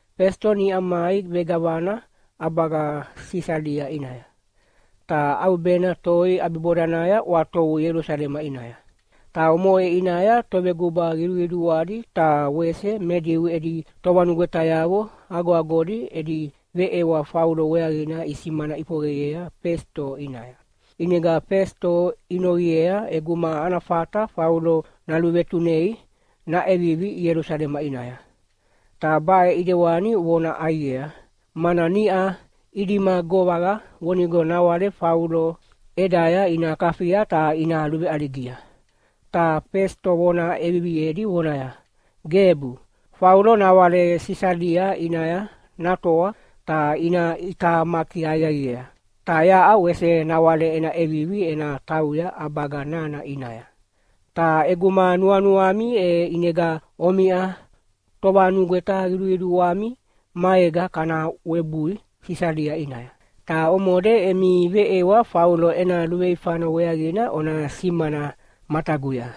Fesito niʼa mai vegavana ʼabaga Sisalia ʼinaya. Ta ʼaubena toi ʼabibodanaya ʼwatovu Ielusalema ʼinaya. Ta omoʼe ʼinaya toveguba qiduqiduadi ta wese me Diu edi tovanugwetayavo agoagodi edi veʼewa Faulo weaqina isimana ʼifoqeyea Fesito ʼinaya. ʼInega Fesito inoqiea ʼeguma ana fata Faulo naluvetunei naʼevivi Ielusalema ʼinaya. Ta baʼe ʼidewani ivona ʼaiqea, mana niʼa idima govaqa vonigo nawale Faulo ʼedaya ina kafia ta ina luveʼaligia. Ta Fesito vona ʼeviviedi vonaya, “Gebu, Faulo nawale Sisalia ʼinaya natoa ta ina ʼitamaki aqiaqiea, ta yaʼa wese nawale ena ʼevivi ena tauya ʼabaga nana ʼinaya! Ta ʼeguma nuanuami e ʼinega omiʼa tovanugweta qiduqiduami maega kana webui Sisalia ʼinaya. Ta omode emi veʼewa Faulo ena luveifana weaqina ona simana mataguya.”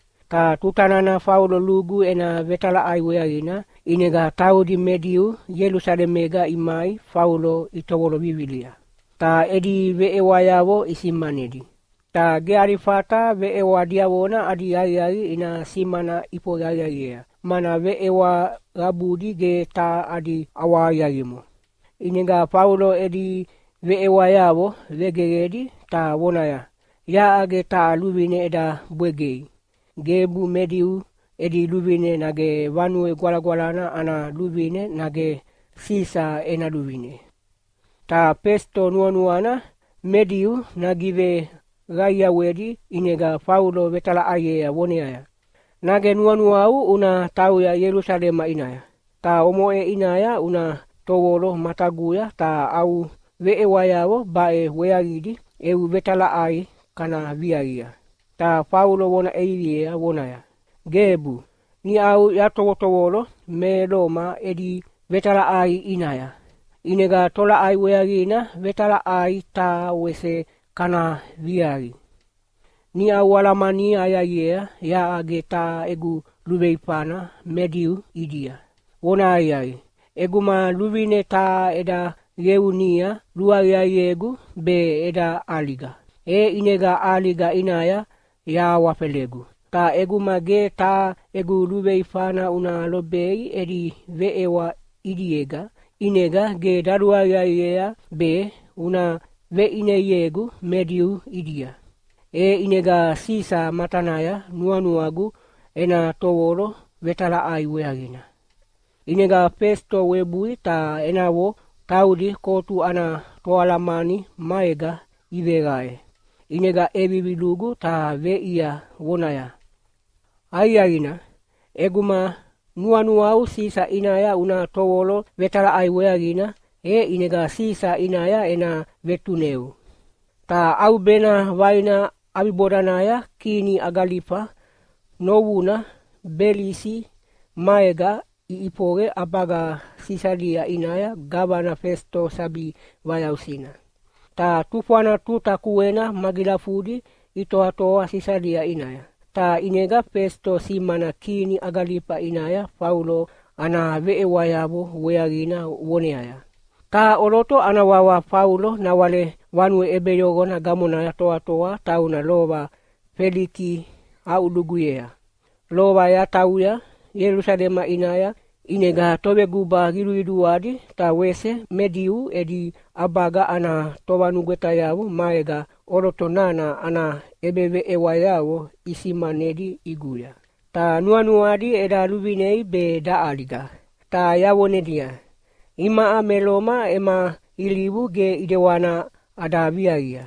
Ta tuta nana Faulo lugu ena vetalaʼai weaqina, ʼinega taudi me Diu Ielusalemega imai Faulo itovolo vivilia, ta edi veʼewayavo isimanedi. Ta ge adi fata veʼewa diavona adi aqiaqi ina simana ʼifoqe aqiaqiea, mana veʼewa qabudi ge taha adi ʼawahaqiaqimo. ʼInega Faulo edi veʼewayavo vegeqedi ta vonaya, “Yaʼa ge taha luvine eda bwegei, gebu me Diu edi luvine nage Vanue Gwalagwalana ana luvine nage Sisa ena luvine.” Ta Fesito nuanuana me Diu nagiveqaiawedi ʼinega Faulo vetalaʼaiea voneaya, “Nage nuanuau una tauya Ielusalema ʼinaya, ta omoʼe ʼinaya una tovolo mataguya ta au veʼewayavo baʼe weaqidi eu vetalaʼai kana viaqia?” Ta Faulo vona ʼeviviea voneaya, “Gebu, niʼau yatovotovolo me Loma edi vetalaʼai ʼinaya, ʼinega tolaʼai weaqina vetalaʼai taha wese kana viaqi? Niʼa ualamania aqiaqiea yaʼa ge taha egu luveifana me Diu ʼidia. Vonahaqiaqi, ʼeguma luvine taha eda qeunia luaqiaqiegu be eda ʼaliga, e ʼinega ʼaliga ʼinaya yahawafelegu. Ta ʼeguma ge taha egu luveifana una lobei edi veʼewa ʼidiega, ʼinega ge daluaqiaqiea be una veʼineiegu me Diu ʼidia. E ʼinega Sisa matanaya nuanuagu ena tovolo vetalaʼai weaqina.” ʼInega Fesito webui ta enavo taudi kotu ana toalamani maega iveqae, ʼinega ʼevivi lugu ta veʼiea vonaya, “Aqiaqina, ʼeguma nuanuau Sisa ʼinaya una tovolo vetalaʼai weaqina, e ʼinega Sisa ʼinaya ena vetuneu!” Ta ʼaubena vaina ʼabibodanaya kini Akalifa novuna Belisi maega iʼifoqe ʼabaga Sisalia ʼinaya gavana Fesito sabi vayausina. Ta tufwana tuta kuena magilafudi itoatoa Sisalia ʼinaya, ta ʼinega Fesito simana kini Akalifa ʼinaya Faulo ana veʼewayavo weaqina voneaya, “Taha ʼoloto ana wawa Faulo nawale vanue ʼebeyoqona gamonaya toatoa tauna lova Feliki aʼuluguyea. Lova yatauya Ielusalema ʼinaya, ʼinega toveguba qiduqiduadi ta wese me Diu edi ʼabaga ana tovanugwetayavo maega ʼoloto nana ana ʼebeveʼewayavo isimanedi ʼiguya. Ta nuanuadi eda luvinei be daʼaliga. Ta yavonedia, ‘Imaʼa me Loma ema ilivu ge ʼidewana ada viaqia,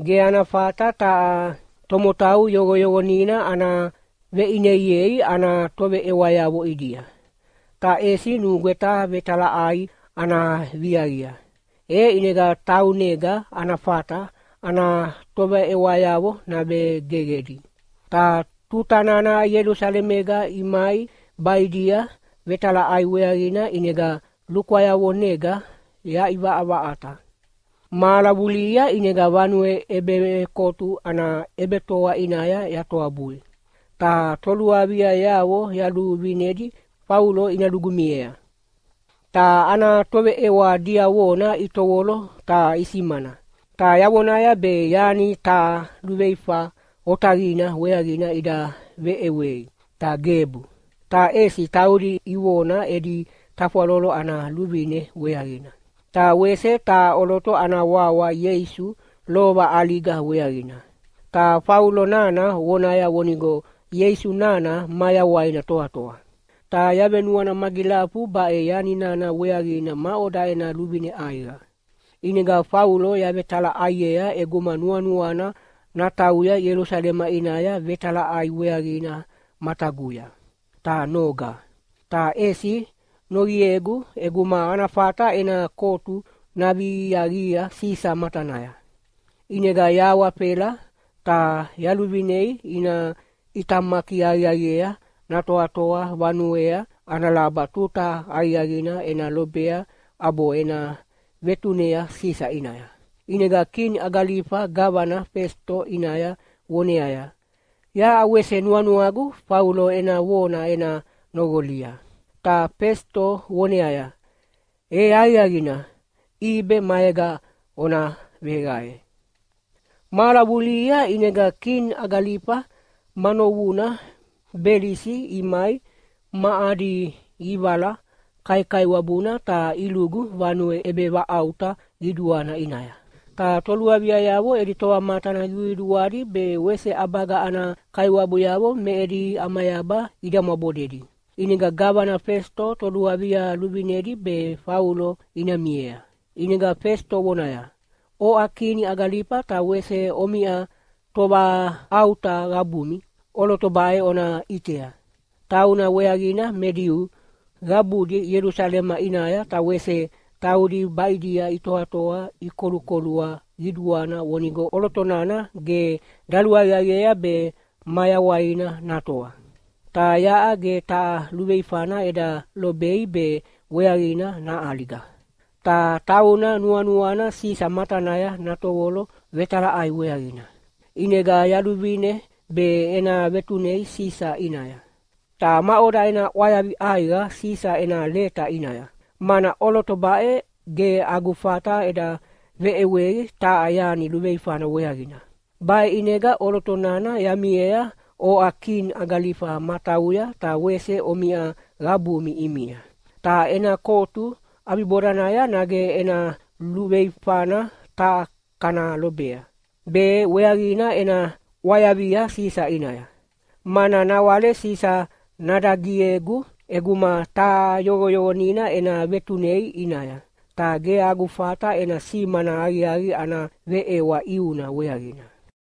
ge ana fata taha tomotau yoqoyoqonina ana veʼineiei ana toveʼewayavo ʼidia. Ta ʼesi nugweta vetalaʼai ana viaqia, e ʼinega taunega ana fata ana toveʼewayavo navegeqedi.’ Ta tuta nana Ielusalemega imai baʼidia vetalaʼai weaqina ʼinega lukwayavonega yaʼivaʼavaʼata. Mahala vulihia ʼinega vanue ʼebevekotu ana ʼebetoa ʼinaya yatoabui, ta toluaviayavo yaluvinedi Faulo ina lugu miea. Ta ana toveʼewa diavona itovolo ta isimana, ta yavonaya be yani taha luveifa otaqina weaqina ida veʼewei, ta gebu. Ta ʼesi taudi ivona edi tafwalolo ana luvine weaqina, ta wese taha ʼoloto ana wawa Ieisu lova ʼaliga weaqina. Ta Faulo nana vonaya vonigo Ieisu nana mayawaina toatoa. Ta yavenuana magilafu baʼe yani nana weaqina maʼoda ena luvine ʼaiqa. ʼInega Faulo yavetalaʼaiea ʼeguma nuanuana natauya Ielusalema ʼinaya vetalaʼai weaqina mataguya, ta noga. Ta ʼesi noqiegu ʼeguma ana fata ena kotu naviaqia Sisa matanaya. ʼInega yahawafela ta yaluvinei ina ʼitamaki aqiaqiea natoatoa vanuea ana laba tuta aqiaqina ena lobea ʼabo ena vetunea Sisa ʼinaya.” ʼInega kini Akalifa gavana Fesito ʼinaya voneaya, “Yaʼa wese nuanuagu Faulo ena vona ena noqolia!” Ta Fesito voneaya, “E aqiaqina, ʼibe maega ona veqae.” Mahala vulihia ʼinega kini Akalifa ma novuna Belisi imai ma adi ʼivala kaikaiwabuna ta ilugu vanue ʼebevaʼauta qiduana ʼinaya. Ta toluaviayavo edi tovamatana qiduqiduadi be wese ʼabaga ana kaiwabuyavo me edi ʼamayaba idamwabodedi. ʼInega gavana Fesito toluavia luvinedi be Faulo ina miea. ʼInega Fesito vonaya, “Oʼa kini Akalifa ta wese omiʼa tovaʼauta qabumi, ʼoloto baʼe ona ʼitea! Tauna weaqina me Diu qabudi Ielusalema ʼinaya ta wese taudi baʼidia itoatoa ikolukolua qiduana vonigo ʼoloto nana ge daluaqiaqiea be mayawaina natoa. Ta yaʼa ge taha luveifana eda lobei be weaqina naʼaliga. Ta tauna nuanuana Sisa matanaya natovolo vetalaʼai weaqina. ʼInega yaluvine be ena vetunei Sisa ʼinaya. Ta maʼoda ena ʼwayavi ʼaiqa Sisa ena leta ʼinaya? Mana ʼoloto baʼe ge agu fata eda veʼewei taha yani luveifana weaqina. Baʼe ʼinega ʼoloto nana yamiea oʼa kini Akalifa matauya ta wese omiʼa qabumi ʼimia. Ta ena kotu ʼabibodanaya nage ena luveifana taha kana lobea, be weaqina ena ʼwayavia Sisa ʼinaya. Mana nawale Sisa nadagiegu ʼeguma taha yoqoyoqonina ena vetunei ʼinaya, ta ge agu fata ena simana aqiaqi ana veʼewa ʼiuna weaqina.”